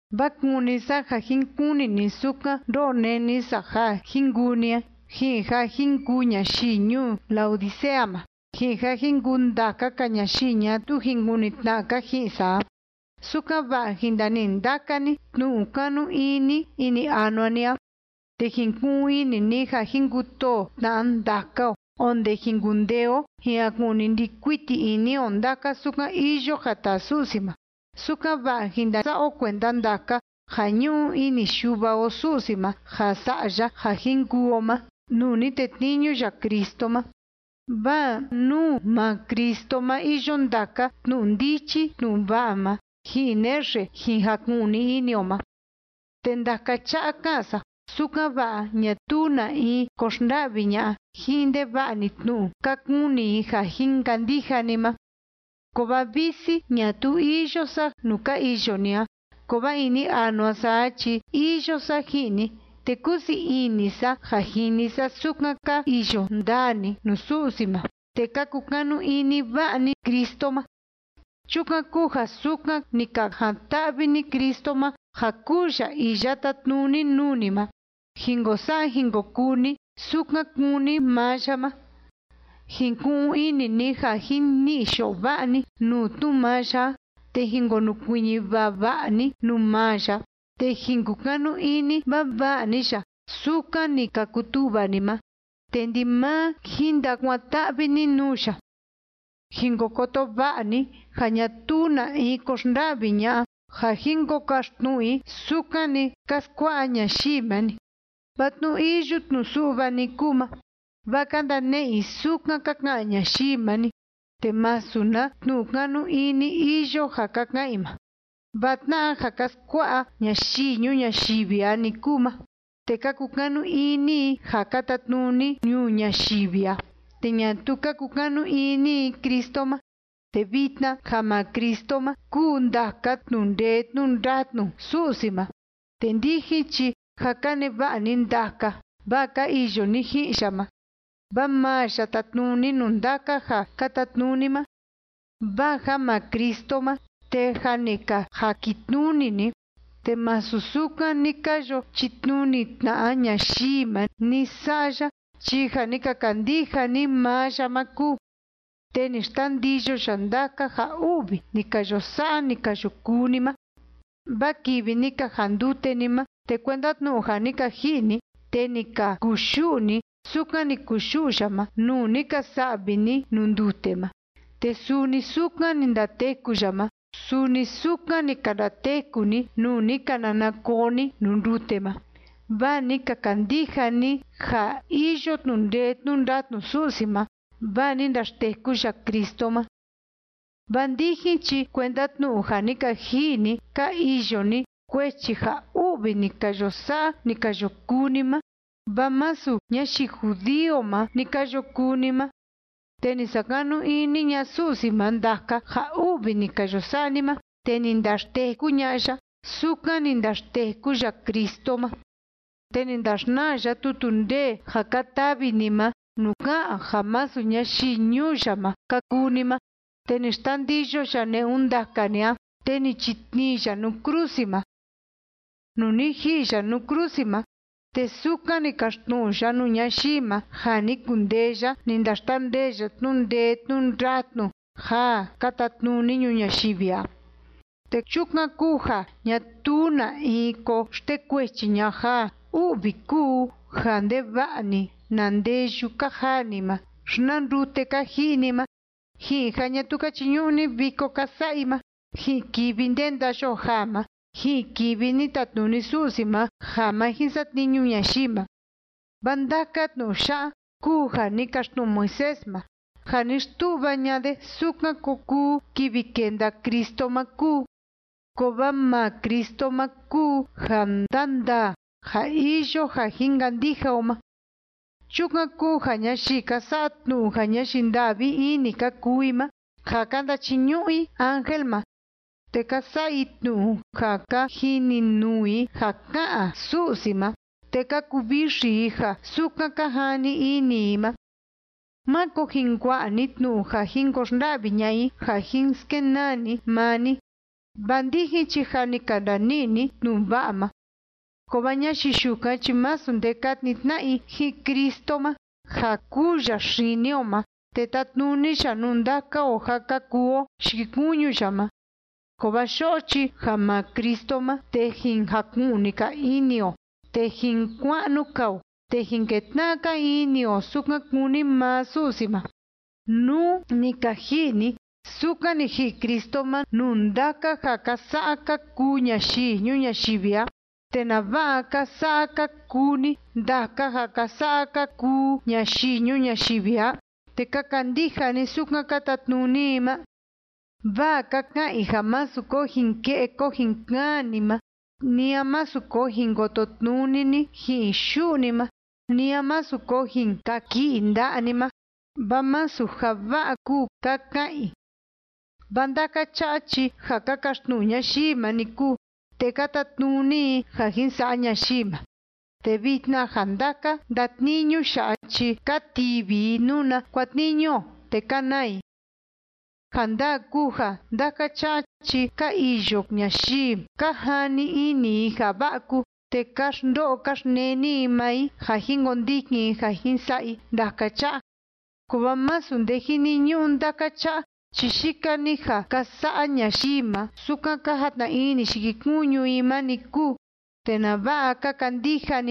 Vaa kúni sa ja jin kuni ni sukan ndo'o neni sa ja jin kuu ni a, ji'in ja jin kuu ñayii ñuu Laodicea ma, ji'in ja jin kuu ndaka‑ka ñayii ñatuu jin kuni tna'a‑ka ji'in sa a, sukan‑va'a jin ndani'i ndaka ni tnu'u kanu ini ini anua ni a, te jin ku'un ini ni ja jin kutoo tna'a ndaka o, onde jin kundee o jin jaku'ni ndi'i kuiti ini o ndaka sukan iyo ja taa Su'si ma, sukan‑va'a jin ndasa'a o kuenda ndaka ja ñu'u ini Yuva o Su'si ma ja sa'a ya ja jin kuu o ma nuu ni tetniñu ya Cristo ma. Vaa nuu maa Cristo ma iyo ndaka tnu'u ndichi tnu'u va'a ma, ji'in naxe jin jaku'ni ini o ma. Te ndaka cha'a ká'an sa, sukan‑va'a ñatuu na in ko xnda'vi ña'a ji'in ndeva'a‑ni tnu'u ka kuni i ja jin kandija ni ma. Kovaa visi ñatuu iyo sa nuu ka iyo ni a, kovaa ini anua sa a chi iyo sa ji'in ni, te kúsii ini sa ja jini sa sukan ka iyo ndaa ni nuu Su'si ma, te ka kukanu ini va'a ni Cristo ma. Chukan kúu ja sukan ni ka jan‑ta'vi ni Cristo ma ja kuu ya iya tátnuni nuu ni ma, jin ko sa'a jin ko kuu ni sukan kúni maa ya ma. Jin ku'un ini ni ja jin ni'i yo'o va'a ni nuu tnu'u maa ya a, te jin konukuiñi vava'a ni nuu maa ya a, te jin kukanu ini vava'a ni ya, sukan ni ka kutu'va ni ma. Te ndimaa jin ndakuan‑ta'vi ni nuu ya. Jin ko koto va'a ni ja ñatuu na in ko xnda'vi ña'a ja jin ko kaxtnu'u i sukan‑ni ka skua'a ñayii ma‑ni, vaa tnu'u iyu tnu'u su'va‑ni kúu ma, vaa ka ndane'e i sukan ka ka'an ñayii ma‑ni, te masu na tnu'u kanu ini iyo ja ka ka'an i ma. Vaa tna'a ja ka skua'a ñayii ñuu ñayivi a‑ni kúu ma, te ka kukanu ini i ja ka tatnuni ñuu ñayivi a, te ñatuu ka kukanu ini i Cristo ma. Te vitna ja maa Cristo ma kúu ndaka tnu'u ndee tnu'u ndatnu Su'si ma. Te ndijin chi jâ ka neva'a ni ndaka, vaa ka iyo ni ji'in ya ma. Vaa maa ya tátnuni nuu ndaka ja ka tatnuni ma. Vaa ja maa Cristo ma, te jâ ni ka jakitnuni ni, te masu sukan ni ka yo chitnuni tna'a ñayii ma ni sa'a ya chi ja ni ka kandija ni maa ya ma kúu, te ni xtandiyo ya ndaka ja u'vi ni ka yo sa'a, ni ka yo kuu ni ma. Vaa kivi ni ka jandute ni ma, te kuenda tnu'u ja ni ka ji'i ni, te ni ka kuyu'u ni sukan ni kuyu'u ya ma, nuu ni ka sa'vi ni nuu ndute ma. Te suni sukan ni ndateku ya ma, suni sukan ni ka ndateku ni, nuu ni ka nana koo ni nuu ndute ma. Vaa ni ka kandija ni ja iyo tnu'u ndee tnu'u ndatnu Su'si ma, vaa ni ndaxteku ya Cristo ma. Vaa ndijin chi kuenda tnu'u ja ni ka ji'i ni, ka iyo ni, kuechi ja u'vi ni ka yo sa'a, ni ka yo kuu ni ma, vaa masu ñayii judío ma ni ka yo kuu ni ma. Te ni sakanu ini ña'a Su'si ma ndaka ja u'vi ni ka yo sa'a ni ma, te ni ndaxteku ña'a ya, sukan ni ndaxteku ya Cristo ma. Te ni ndaxnaa ya tutu ndee ja ka tavi ni ma nuu ká'an ja masu ñayii ñuu ya ma ka kuu ni ma, te ni xtandiyo ya ne'un ndaka ni a, te ni chitnii ya nuu krusi ma. Nuu ni ji'i ya nuu krusi ma, te sukan ni kaxtnu'u ya nuu ñayii ma ja ni kundee ya ni ndaxtandee ya tnu'u ndee tnu'u ndatnu ja ka tatnuni ñuu ñayivi a. Te chukan kúu ja ñatuu na in ko xtekuechi ña'a ja u'vi kúu ja ndeva'a‑ni na ndeyu ka jaa ni ma, xi na ndute ka ji'i ni ma, ji'in ja ñatuu ka chiñu'u ni viko ka sa'a i ma, ji'in kivi ndenda yoo jaa ma, ji'in kivi ni tatnuni Su'si ma ja ma jin satniñu ñayii ma. Vaa ndaka tnu'u ya'a kúu ja ni kaxtnu'u Moisés ma, ja ni xtu'va ña'a de sukan ko kuu kivi kenda Cristo ma kúu. Kovaa maa Cristo ma kúu ja ndandaa ja iyo ja jin kandija o ma. Chukan kúu ja ñayii ka sa'a tnu'u ja ñayii nda'vi ini ka kuu i ma, ja ka ndachiñu'u i ángel ma, te ka sa'a i tnu'u ja ka jininuu i ja ká'an Su'si ma, te ka kuvixi i ja sukan ka jani ini i ma, máko jin kua'a ni tnu'u ja jin ko xnda'vi ña'a i ja jin skenaa ni maa ni, vaa ndijin chi jâ ni ka ndani'i ni tnu'u va'a ma. Kovaa ñayii yukan chi masu nde ka tnii tna'a i ji'in Cristo ma, ja kúu ya xini o ma te tátnuni ya nuu ndaka o ja ka kuu o yikikuñu ya ma. Kovaa yo'o chi ja maa Cristo ma, te jin jaku'ni‑ka ini o, te jin kua'nu‑ka o, te jin ketna'a‑ka ini o sukan kúni maa Su'si ma. Nú ni ka ji'i ni sukan ni ji'i Cristo ma nuu ndaka ja ka sa'a ka kuu ñayii ñuu ñayivi a, ¿te nava'a ka sa'a ka kuu ni ndaka ja ka sa'a ka kuu ñayii ñuu ñayivi a, te ka kandija ni sukan ka tatnuni i ma? Vaa ka ka'an i ja másu ko jin ke'e ko jin kaan ni ma, ni a másu ko jin kototnuni ni ji'in yu'u ni ma, ni a másu ko jin kaki'i nda'a ni ma, vaa masu ja va'a kúu, ka ka'an i. Vaa ndaka cha'a chi ja ka kaxtnu'u ñayii ma‑ni kúu, te ka tatnuni i ja jin sa'a ñayii ma, te vitna ja ndaka ndatniñu ya'a chi ka tivi i nuna kuatniñu o, te ka naa i. Ja ndaa kúu ja ndaka cha'a chi ka iyo ñayii ka jani ini i ja va'a kúu, te ka xndo'o ka xneni i maa i ja jin kondikin i ja jin sa'a i ndaka cha'a, kovaa masu nde jiniñu'u ndaka cha'a, chi yika‑ni ja ka sa'a ñayii ma sukan ka jatna ini yikikuñu i ma‑ni kúu. ¿Te nava'a ka kandija ni ma?